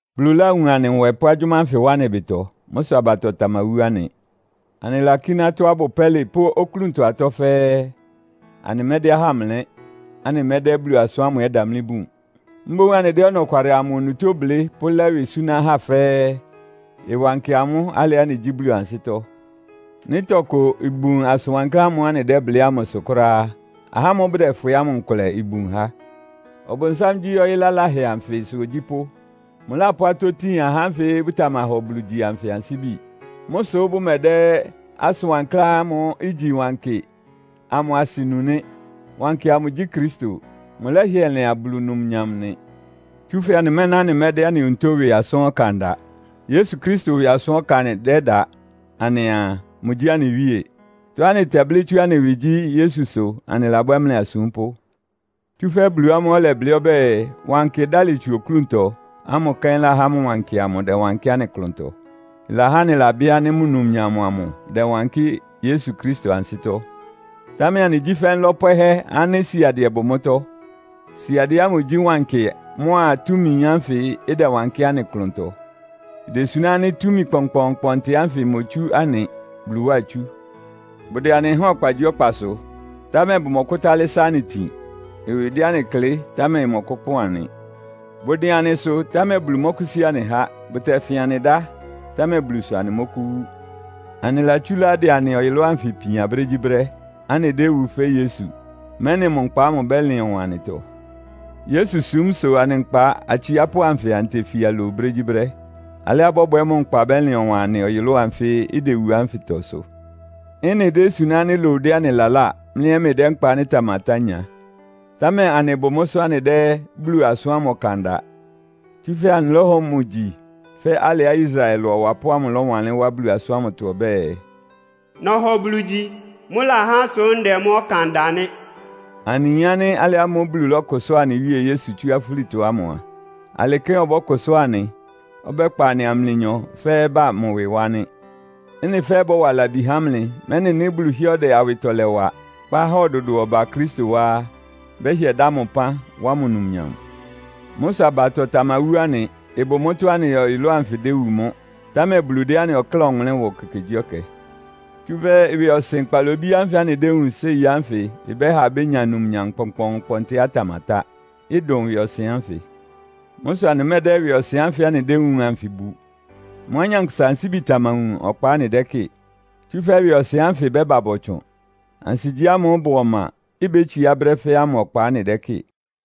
Bulu láwun anɩ nwɛ pʋ́ agyʋ́má ánfɩ wá anɩ ɩbɩtɔ. Mʋ́ sʋ abatɔ tamawú anɩ. Anɩlakíná tɔ́á ɩbʋ pɛ́lɩ pʋ́ oklúntɔ atɔ́ fɛ́ɛ́. Anɩmɛ́dɛ́ ahá mlɛ́, anɩmɛ́dɛ́ Bulu asʋ́n ámʋ ɛ́ damlí bun. Mboún anɩdɛ́ ɔnɔkwalɩ amʋ onutó blɩ́ pʋ́lɛ́ ɩwɩ súná ahá fɛ́ɛ́, ɩwankɩ amʋ́ alɩá anɩgyí Bulu ansɩ́tɔ́. Nɩ́ tɔkʋ ibun asʋn wankláán ámʋ́ʋ́ anɩdɛ́blɩ́ ámʋsʋ kʋ́ráá á, ahá ámʋ́ʋ́ bʋdɛfwɩ ámʋ nkʋlɛ ibun há. Ɔbʋnsám gyí ɔyɩ́ laláhɛ anfɩsʋ ogyípʋ́. Mʋlápʋ́ atɔ́ tin ahá ánfɩ bʋtamahɔ Bulu gyi anfɩ ansíbi. Mʋ́ sʋ́ bʋmɛdɛ́ asʋn wankláán ámʋ́ʋ́ igyi wankɩ amʋ asɩ nu nɩ́. Wankɩ amʋ gyí Kristo. Mʋlɛ́hɩɛ lɩan Bulu numnyam nɩ. Tsúfɛ́ anɩmɛ́ná anɩmɛ́dɛ́ anɩ onutó ɩwɩ asʋ́n ɔkan da. Yesu Kristo ɩwɩ asʋ́n ɔkan anɩdɛ́da anɩaa, mʋgyí anɩ Wíe. Tɔ́á anɩtɛblɩ́ tsú anɩ ɩwɩ gyí, Yesu sʋ anɩlabwɛ́ mlɩ asúmpʋ́. Tsúfɛ́ Bulu ámʋ́ʋ́ ɔlɛblɩ́ ɔbɛ́ɛ, “Wankɩ ɩdálɩ tsu oklúntɔ!” ámʋ kɛ́n lahá mʋ wankɩ amʋ ɩdɛwankɩ́ anɩ klʋntɔ. Ɩlahá anɩlabɩ́ ánɩ́ mʋ numnyam amʋ ɩdɛwankɩ́ Yesu Kristo ansɩ́tɔ́. Támɛ anɩgyí fɛ́ nlɔ́ pwɛhɛ́ ánɩ́ siadɩɛ bʋ mʋ́tɔ́. Siadɩɛ ámʋ gyí wankɩ mʋ́a túmi ánfɩ ɩdɛwankɩ́ anɩ klʋntɔ. Idesuná ánɩ́ túmi kpɔnkpɔɔnkpɔntɩ ánfɩ imotsú anɩ, Bulu wá itsú. Bʋdɛ anɩ háan ɔkpagyíɔkpasʋ, támɛ bʋmɔkʋ́tálɩ́ sá anɩ tin. Ɩwɩ dɛ anɩ klɩ́, támɛ ɩmɔkʋ́kpɔn anɩ. Bʋdɩn anɩsʋ, támɛ Bulu mɔ́kʋ́sí anɩ há. Bʋtɛfɩn anɩ dá, támɛ Bulu sʋ anɩmɔ́kʋ́wú. Anɩlatsúlá ɩdɛ anɩ ɔyʋlʋ́ʋ anfɩ ipian brégyíbrɛ́, anɩdéwu fɛ́ Yesu, mɛ́nɩ mʋ nkpa ámʋ ɩbɛ́lɩn ɔwan anɩtɔ. Yesu súm sʋ anɩ nkpa atsiápʋ́ anfɩ anɩtefia lowu brégyíbrɛ́. Alɩá ɩbɔ́bwɛ mʋ nkpa bɛ́lɩn ɔwan anɩ ɔyʋlʋ́ʋ anfɩ́ idewu ánfɩtɔ sʋ. Ɩ́nɩ désuná ánɩ́ lowu dɛ́ anɩ laláa, mlɩ ɛ́ mlɩdɛ́ nkpa ánɩ́ ɩtamatá nya. Támɛ anɩbʋ mʋ́sʋ́ anɩdɛ́ Bulu asʋ́n ámʋ ɔkan da. Tsúfɛ́ anɩlɔ́hɔ mʋ gyi fɛ́ alɩá Israel ɩlʋ ɔwapʋ́ ámʋ lɔ́wanlɩ́n wá Bulu asʋ́n ámʋtɔ ɔbɛ́ɛ, “Nɔhɔ Bulu gyi. Mʋ́lahá sʋ́ ndɛ mʋ́ ɔkan da nɩ́.” Anɩyin ánɩ́ alɩ ámʋ́ʋ́ Bulu lɔ́kʋsʋ́a anɩ Wíe Yesu tsú afúlitɔ ámʋ a, alɩ kɛ́n ɔbɔ́kʋsʋ́a anɩ, ɔbɛ́kpa anɩa mlɩnyɔ fɛ́ɛ́ ba mʋ ɩwɩ wá nɩ́. Ɩ́nɩ fɛ́ɛ́ bɔ́wa labi há mlɩ, mɛ́nɩ nɩ́ Bulu hɩ́ɛ́ ɔdɛ awɩtɔlɛ wa, kpá ahá ɔdʋdʋɔ ba Kristo wá á, bɛ́hɩɛ dá mʋ ɩpán, wá mʋ numnyam. Mʋ́ sʋ abatɔ tamawú anɩ. Ɩbʋ mʋ́tɔ́á anɩ ɔyʋlʋ́ʋ anfɩ idewu mʋ́, támɛ Bulu dɛ́ anɩ ɔkláa ɔwʋnlɩ́n wa ekekegyíɛkɛ. Tsúfɛ́ ɩwɩɔsɩn kpalobí ánfɩ anɩdéwúun séi ánfɩ ɩbɛ́ha abénya numnyam kpɔnkpɔɔnkpɔntɩá ɩtamatá, ɩdʋn ɩwɩɔsɩn ánfɩ. Mʋ́ sʋ anɩmɛ́dɛ́ ɩwɩɔsɩn ánfɩ anɩdéwúun anfɩ bu. Mʋ́á nyankpʋsa ansíbi tamawun ɔkpa anɩdɛ́kɩ́ɩ. Tsúfɛ́ ɩwɩɔsɩn ánfɩ ɩbɛ́ba bɔtsʋn. Ansigyí ámʋ́ʋ́ ɩbʋ ɔma, ibétsiá brɛ́ fɛ́ɛ́ ámʋ ɔkpa anɩdɛ́kɩ́ɩ.